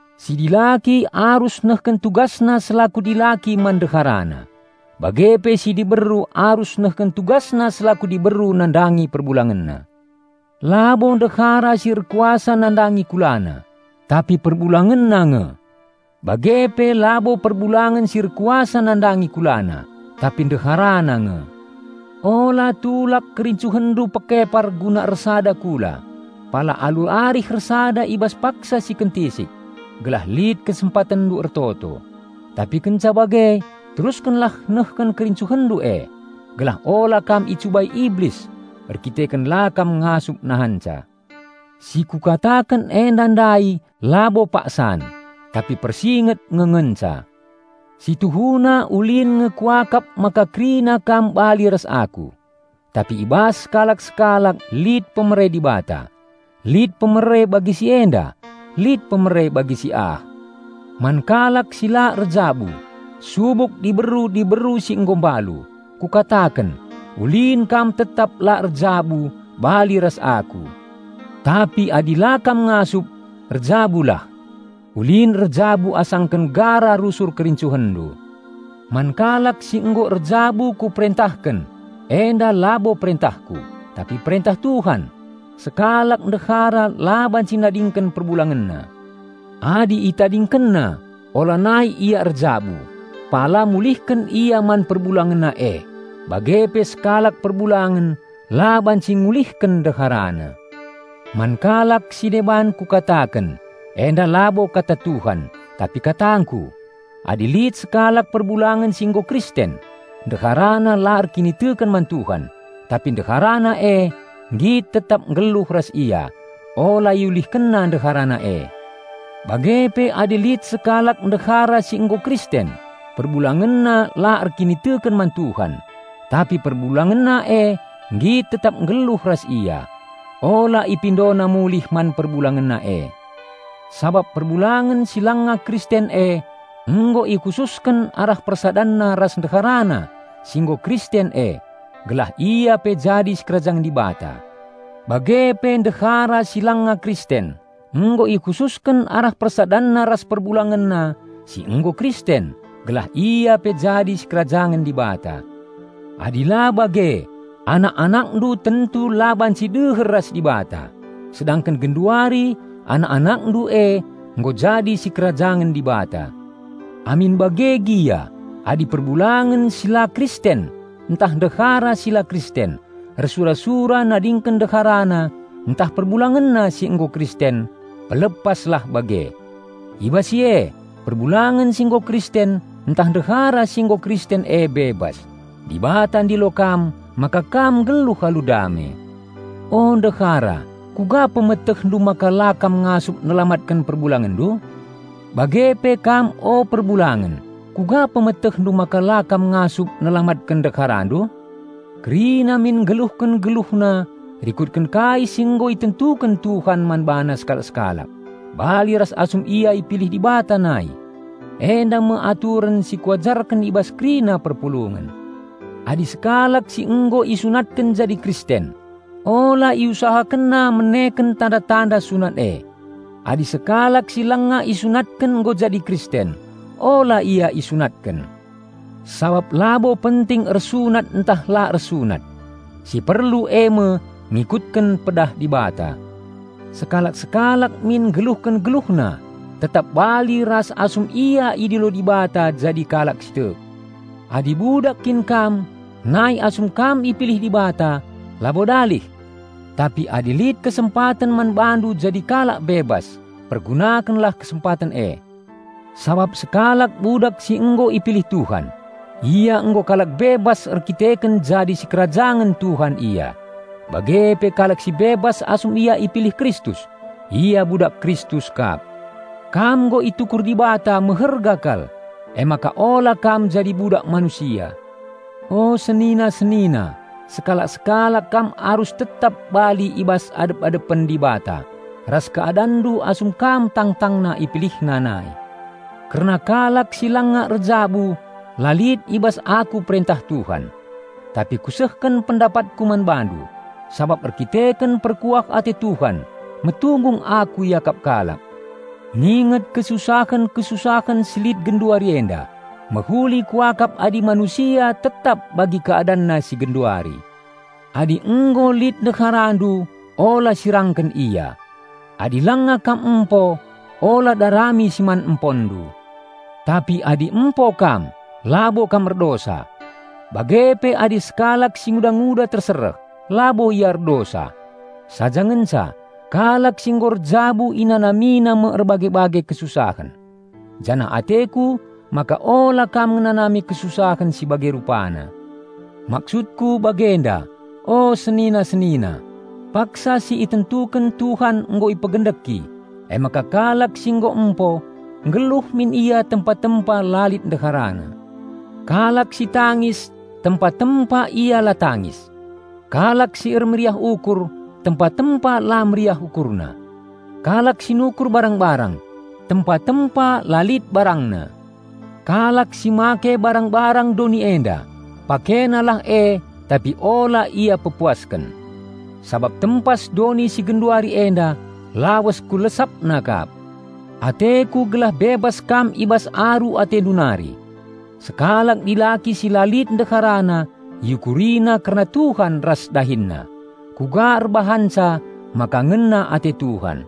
Si dilaki arus nehken tugasna selaku dilaki man ndeharana, bage pe si diberu arus nehken tugasna selaku diberu nandangi perbulangenna. Labo ndehara si erkuasa nandangi kulana, tapi perbulangenna nge. Bage pe labo perbulangen si erkuasa nandangi kulana, tapi ndeharana nge. Ula tulak kerincuhenndu pekepar guna ersada kula, pala alu arih ersada i bas paksa si kentisik, gelah lit kesempatenndu ertoto; tapi kenca bage teruskenlah nehken kerincuhenndu e, gelah ula kam icubai iblis erdandanken la kam ngasup nahanca. Si kukataken enda ndai labo paksan, tapi persunget nge ngenca. Si tuhuna ulin nge kuakap maka kerina kam bali ras aku; tapi i bas sekalak-sekalak lit pemere Dibata; lit pemere bagi si enda, lit pemere bagi si ah. Man kalak si la erjabu, subuk diberu-diberu si nggo mbalu, kukataken: ulin kam tetap la erjabu bali ras aku. Tapi adi la kam ngasup, erjabulah. Ulin erjabu asangken gara rusur kerincuhenndu. Man kalak si nggo erjabu kuperentahken -- enda labo perentahku, tapi perentah Tuhan: sekalak ndehara la banci nadingken perbulangenna. Adi itadingkenna, ulanai ia erjabu, pala mulihken ia man perbulangenna e; bage pe sekalak perbulangen la banci ngulihken ndeharana. Man kalak si deban kukataken (enda labo kata Tuhan, tapi katangku): adi lit sekalak perbulangen si nggo Kristen, ndeharana la erkiniteken man Tuhan, tapi ndeharana e nggit tetap nggeluh ras ia, ula iulihkenna ndeharana e. Bage pe adi lit sekalak ndehara si nggo Kristen, perbulangenna la erkiniteken man Tuhan, tapi perbulangenna e nggit tetap nggeluh ras ia, ula ipindona mulih man perbulangenna e. Sabap perbulangen si langa Kristen e nggo ikhususken arah persadanna ras ndeharana si nggo Kristen e gelah ia pe jadi sikerajangen Dibata. Bage pe ndehara si langa Kristen nggo ikhususken arah persadanna ras perbulangenna si nggo Kristen gelah ia pe jadi sikerajangen Dibata. Adi la bage, anak-anakndu tentu la banci deher ras Dibata; sedangken genduari anak-anakndu e nggo jadi sikerajangen Dibata. Amin bage gia, adi perbulangen si la Kristen ntah ndehara si la Kristen ersura-sura nadingken ndeharana ntah perbulangenna si nggo Kristen pelepaslah bage. I bas si e, perbulangen si nggo Kristen ntah ndehara si nggo Kristen e bebas. Dibata ndilo kam maka kam nggeluh alu dame. O ndehara, kuga pemetehndu maka la kam ngasup nelamatken perbulangenndu? Bage pe kam o perbulangen, kuga pemetehndu maka la kam ngasup nelamatken ndeharandu? Kerina min nggeluhken geluhna rikutken kai si nggo itentuken Tuhan man bana sekalak-sekalak, bali ras asum ia ipilih Dibata nai. Enda me aturen si kuajarken i bas kerina perpulungen. Adi sekalak si nggo isunatken jadi Kristen, ula iusahakenna meneken tanda-tanda sunat e. Adi sekalak si langa isunatken nggo jadi Kristen, ula ia isunatken. Sabap labo penting ersunat ntah la ersunat. Si perlu eme ngikutken pedah Dibata. Sekalak-sekalak min nggeluhken geluhna tetap bali ras asum ia idilo Dibata jadi kalak si tek. Adi budak kin kam nai asum kam ipilih Dibata, labo dalih! Tapi adi lit kesempaten man bandu jadi kalak bebas, pergunakenlah kesempaten e. Sabap sekalak budak si nggo ipilih Tuhan, ia nggo kalak bebas erkiteken jadi sikerajangen Tuhan ia. Bage pe kalak si bebas asum ia ipilih Kristus, ia budak Kristus kap. Kam nggo itukur Dibata meherga kal; emaka ula kam jadi budak manusia. O senina-senina, sekalak-sekalak kam arus tetap bali i bas adep-adepen Dibata ras keadanndu asum kam tangtangna IpilihNa nai. Kerna kalak si langa erjabu la lit i bas aku perentah Tuhan. Tapi kusehken pendapatku man bandu, sabap erdandanken perkuah ate Tuhan metunggung aku iakap kalak. Nginget kesusahen-kesusahen si lit genduari enda, mehuli kuakap adi manusia tetap bagi keadanna si genduari. Adi nggo lit ndeharandu ula sirangken ia. Adi langa kam empo, ula darami si man emponndu. Tapi adi empo kam, labo kam erdosa. Bage pe adi sekalak singuda-nguda tersereh, labo ia erdosa. Saja ngenca, kalak si nggo erjabu inanamina me erbage-bage kesusahen. Janah ateku maka ula kam ngenanami kesusahen si bage rupana. Maksudku bagenda, o senina-senina: paksa si itentuken Tuhan nggo ipegendeki; emaka kalak si nggo empo, nggeluh min ia tempa-tempa la lit ndeharana. Kalak si tangis, tempa-tempa ia la tangis; kalak si ermeriah ukur, tempa-tempa la meriah ukurna; kalak si nukur barang-barang, tempa-tempa la lit barangna. Kalak si make barang-barang doni enda, pakenalah e tapi ula ia pepuasken. Sabap tempas doni si genduari enda lawes ku lesapna kap. Ateku gelah bebas kam i bas aru atendu nari. Sekalak dilaki si la lit ndeharana iukurina kerna Tuhan ras DahinNa, kuga erbahanca maka ngena ate Tuhan.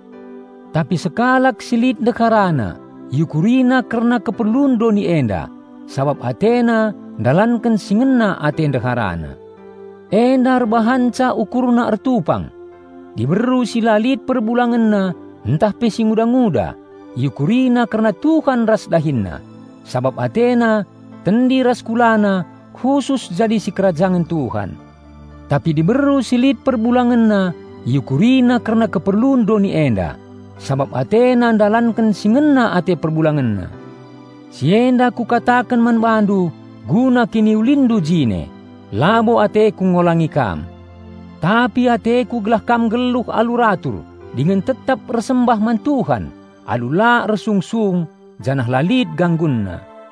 Tapi sekalak si lit ndeharana iukurina kerna keperlun doni enda, sabap atena ndalanken si ngena ate ndeharana. Enda erbahanca ukurna ertupang. Diberu si la lit perbulangenna ntah pe singuda-nguda, iukurina kerna Tuhan ras DahinNa, sabap atena tendi ras kulana khusus jadi sikerajangen Tuhan. Tapi diberu si lit perbulangenna iukurina kerna keperlun doni enda, sabap atena ndalanken si ngena ate perbulangenna. Si enda kukataken man bandu guna kiniulinndu jine. Labo ateku ngolangi kam. Tapi ateku gelah kam nggeluh alu ratur dingen tetap ersembah man Tuhan alu la ersungsung janah la lit ganggunna.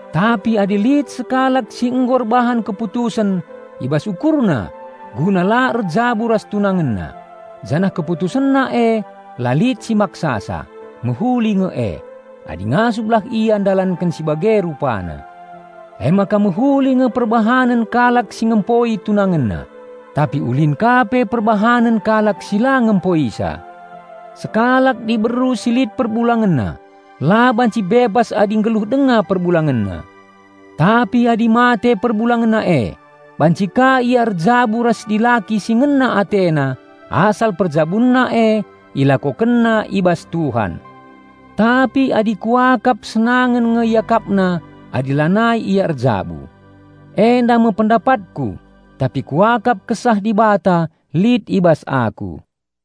Tapi adi lit sekalak si nggo erbahan keputusen i bas ukurna guna la erjabu ras tunangenna, janah keputusenna e la lit si maksasa, mehuli nge e, adi ngasuplah ia ndalanken si bage rupana. Emaka mehuli nge perbahanen kalak si ngempoi tunangenna, tapi ulin ka pe perbahanen kalak si la ngempoisa. Sekalak diberu si lit perbulangenna la banci bebas adi nggeluh denga perbulangenna. Tapi adi mate perbulangenna e, banci ka ia erjabu ras dilaki si ngena atena asal perjabunna e ilakokenna i bas Tuhan. Tapi adi kuakap senangen nge iakapna adi lanai ia erjabu. Enda me pendapatku, tapi kuakap Kesah Dibata lit i bas aku.